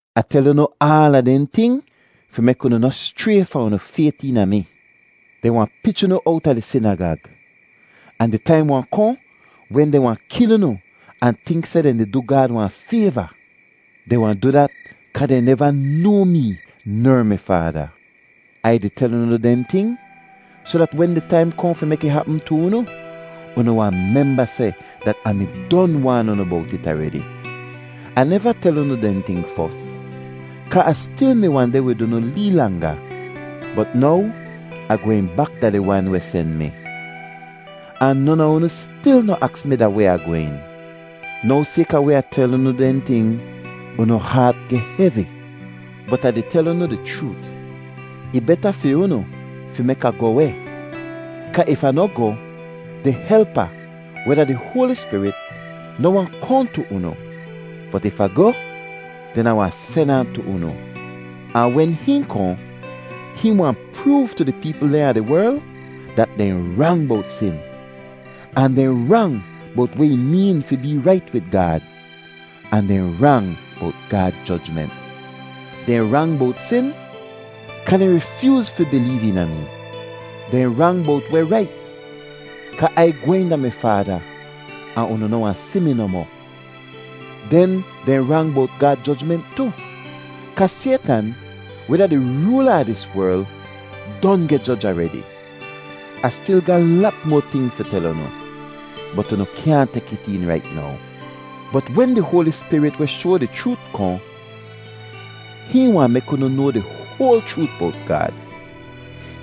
“Ah tel unu aala dehn ting fi mek unu noh schray fahn unu fayt eena mi. Dehn wahn pich unu owta di sinagag, ahn di taim wahn kohn wen dehn wahn kil unu ahn tink seh dehn di du Gaad wahn fayva. Dehn wahn du dat kaa dehn neva noa mee ner mi Faada. Ai di tel unu dehn ting soh dat wen di taim kohn fi mek ih hapm tu unu, unu wahn memba seh dat Ah mi don waan unu bowt it aredi. Ah neva tel unu dehn ting fos, kaa Ah stil mi wahn deh wid unu lee langa. “Bot now Ah gwehn bak da di Wan weh sen mi, ahn non a unu stil noh aks mi da weh Ah gwehn. Now sayka weh Ah tel unu dehn ting, unu haat geh hevi. Bot Ah di tel unu di chroot, ih beta fi unu fi mek Ah goh weh; kaa if Ah noh goh, di Helpa, weh da di Hoali Spirit, noh wahn kohn tu unu; bot if Ah goh, den Ah wahn sen ahn tu unu. Ahn wen hihn kohn, hihn wahn proov tu di peepl dehn a di werl dat dehn rang bowt sin, ahn dehn rang bowt weh ih meen fi bee rait wid Gaad, ahn dehn rang bowt Gaad jojment. Dehn rang bowt sin, kaa dehn rifyooz fi bileev eena mee. Dehn rang bowt weh rait, kaa Ai gwehn da mi Faada ahn unu noh wahn si mi nohmoh. Den dehn rang bowt Gaad jojment tu, kaa Saytan, weh da di roola a dis werl, don geh joj aredi. “Ah stil ga lat moa ting fi tel unu, bot unu kyaahn tek it een rait now. Bot wen di Hoali Spirit weh shoa di chroot kohn, hihn wahn mek unu noa di hoal chroot bowt Gaad.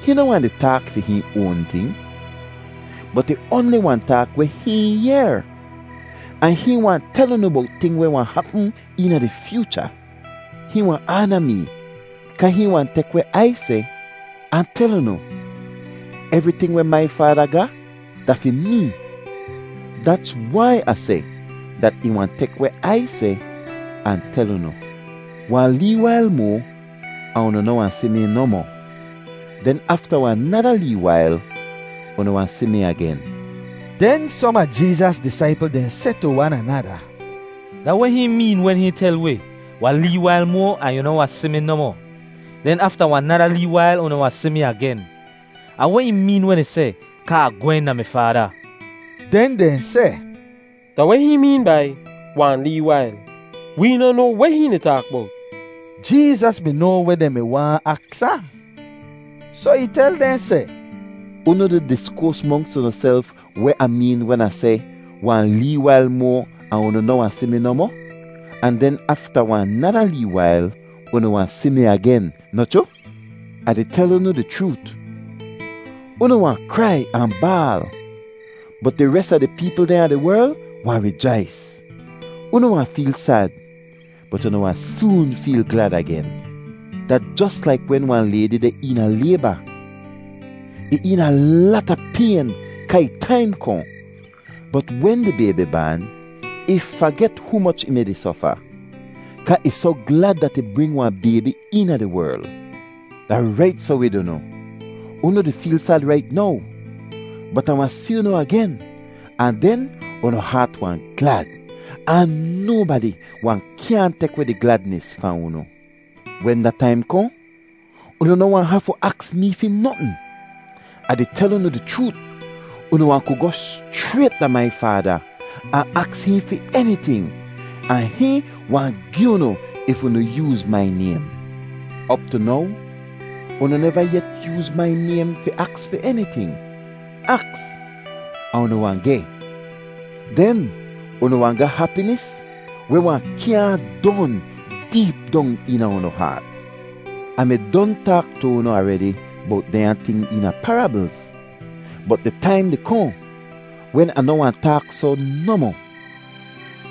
Hihn noh wahn di taak fi hihn oan ting, bot ih oanli wahn taak weh hihn yehr, ahn hihn wahn tel unu bowt ting weh wahn hapm eena di fyoocha. Hihn wahn aana mee kaa hihn wahn tek weh Ai seh ahn tel unu. Evriting weh mai Faada ga da fi mee. Dats wai Ah seh dat ih wahn tek weh Ai seh ahn tel unu. “Wahn lee wail moa ahn unu noh wahn si mi nohmoh; den afta wahn nada lee wail, unu wahn si mi agen.” Den som a Jeezas disaipl dehn seh tu wan anada, “Da weh hihn meen wen hihn tel wi, ‘Wahn lee wail moa ahn unu noh wahn si mi nohmoh; den afta wahn nada lee wail unu wahn si mi agen’? Ahn weh ih meen wen ih seh, ‘Kaa Ah gwehn da mi Faada’?” Den dehn seh, “Da weh hihn meen bai, ‘wahn lee wail’? Wee noh noa weh hihn di taak bowt.” Jeezas mi noa weh dehn mi waahn aks ahn, soh ih tel dehn seh, “Unu di diskoas monks unuself weh Ah meen wen Ah seh, ‘Wahn lee wail moa ahn unu noh wahn si mi nohmoh, ahn den afta wahn nada lee wail unu wahn si mi agen,’ noh chroo? Ah di tel unu di chroot, unu wahn krai ahn baal, bot di res a di peepl dehn a di werl wahn rijais. Unu wahn feel sad, bot unu wahn soon feel glad agen. Da jos laik wen wahn laydi deh eena layba; ih eena lata payn kaa ih taim kohn. Bot wen di baybi baan, ih faget humoch ih mi-di sofa, kaa ih soh glad dat ih bring wahn baybi eena di werl. Da rait soh wid unu. Unu di feel sad rait now, bot Ah wahn si unu agen ahn den unu haat wahn glad, ahn nobadi wahn kyaahn tek weh di gladnis fahn unu. Wen da taim kohn, unu noh wahn hafu aks mee fi notn. Ah di tel unu di chroot, unu wahn ku goh schrayt da mai Faada ahn aks hihn fi eniting, ahn hihn wahn gi unu if unu yooz mai naym. Op tu now unu neva yet yooz mai naym fi aks fi eniting. Aks, ahn unu wahn geh. Den unu wahn ga hapinis weh wahn kyaahn don deep dong eena unu haat. “Ah mi don taak tu unu aredi bowt dehnya ting eena parablz, bot di taim di kohn wen Ah noh wahn taak soh nohmoh;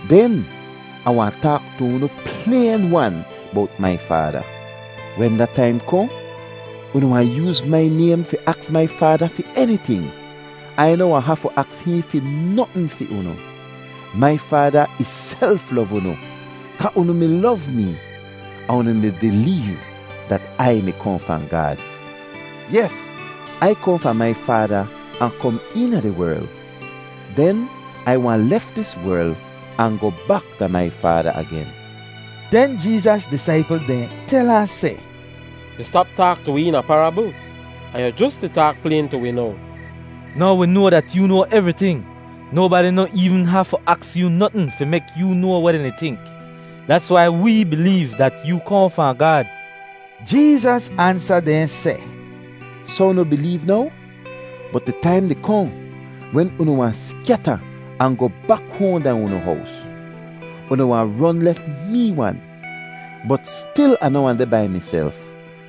den Ah wahn taak tu unu playn-wan bowt mai Faada. Wen da taim kohn, unu wahn yooz mai naym fi aks mai Faada fi eniting. Ai noh wahn hafu aks hihn fi notn fi unu. Mai Faada ihself lov unu kaa unu mi lov mee ahn unu mi bileev dat Ai mi kohn fahn Gaad. Yes, Ai kohn fahn mai Faada ahn kom eena di werl; den Ai wahn lef dis werl ahn goh bak da mai Faada agen.” Den Jeezas disaipl dehn tel ahn seh, “Yu stap taak tu wi eena parablz, ahn yu jos di taak playn tu wi now! Now wi noa dat yoo noa evriting. Nobadi noh eevn hafu aks yoo notn fi mek yoo noa weh dehn di tink! Dats wai wee bileev dat yoo kohn fahn Gaad.” Jeezas ansa dehn seh, “Soh unu bileev now? Bot di taim di kohn wen unu wahn skyata ahn goh bak hoahn da unu hows. Unu wahn ron lef mee wan, bot stil Ah noh wahn deh bai miself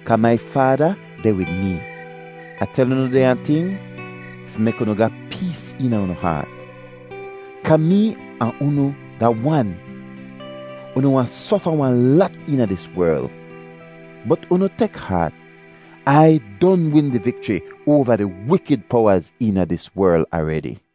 kaa mai Faada deh wid mee. “Ah tel unu dehnya ting fi mek unu ga pees eena unu haat, kaa mee ahn unu da wan. Unu wahn sofa wahn lat eena dis werl, bot unu tek haat, Ai don win di vikchri oava di wikid powaz eena dis werl aredi.”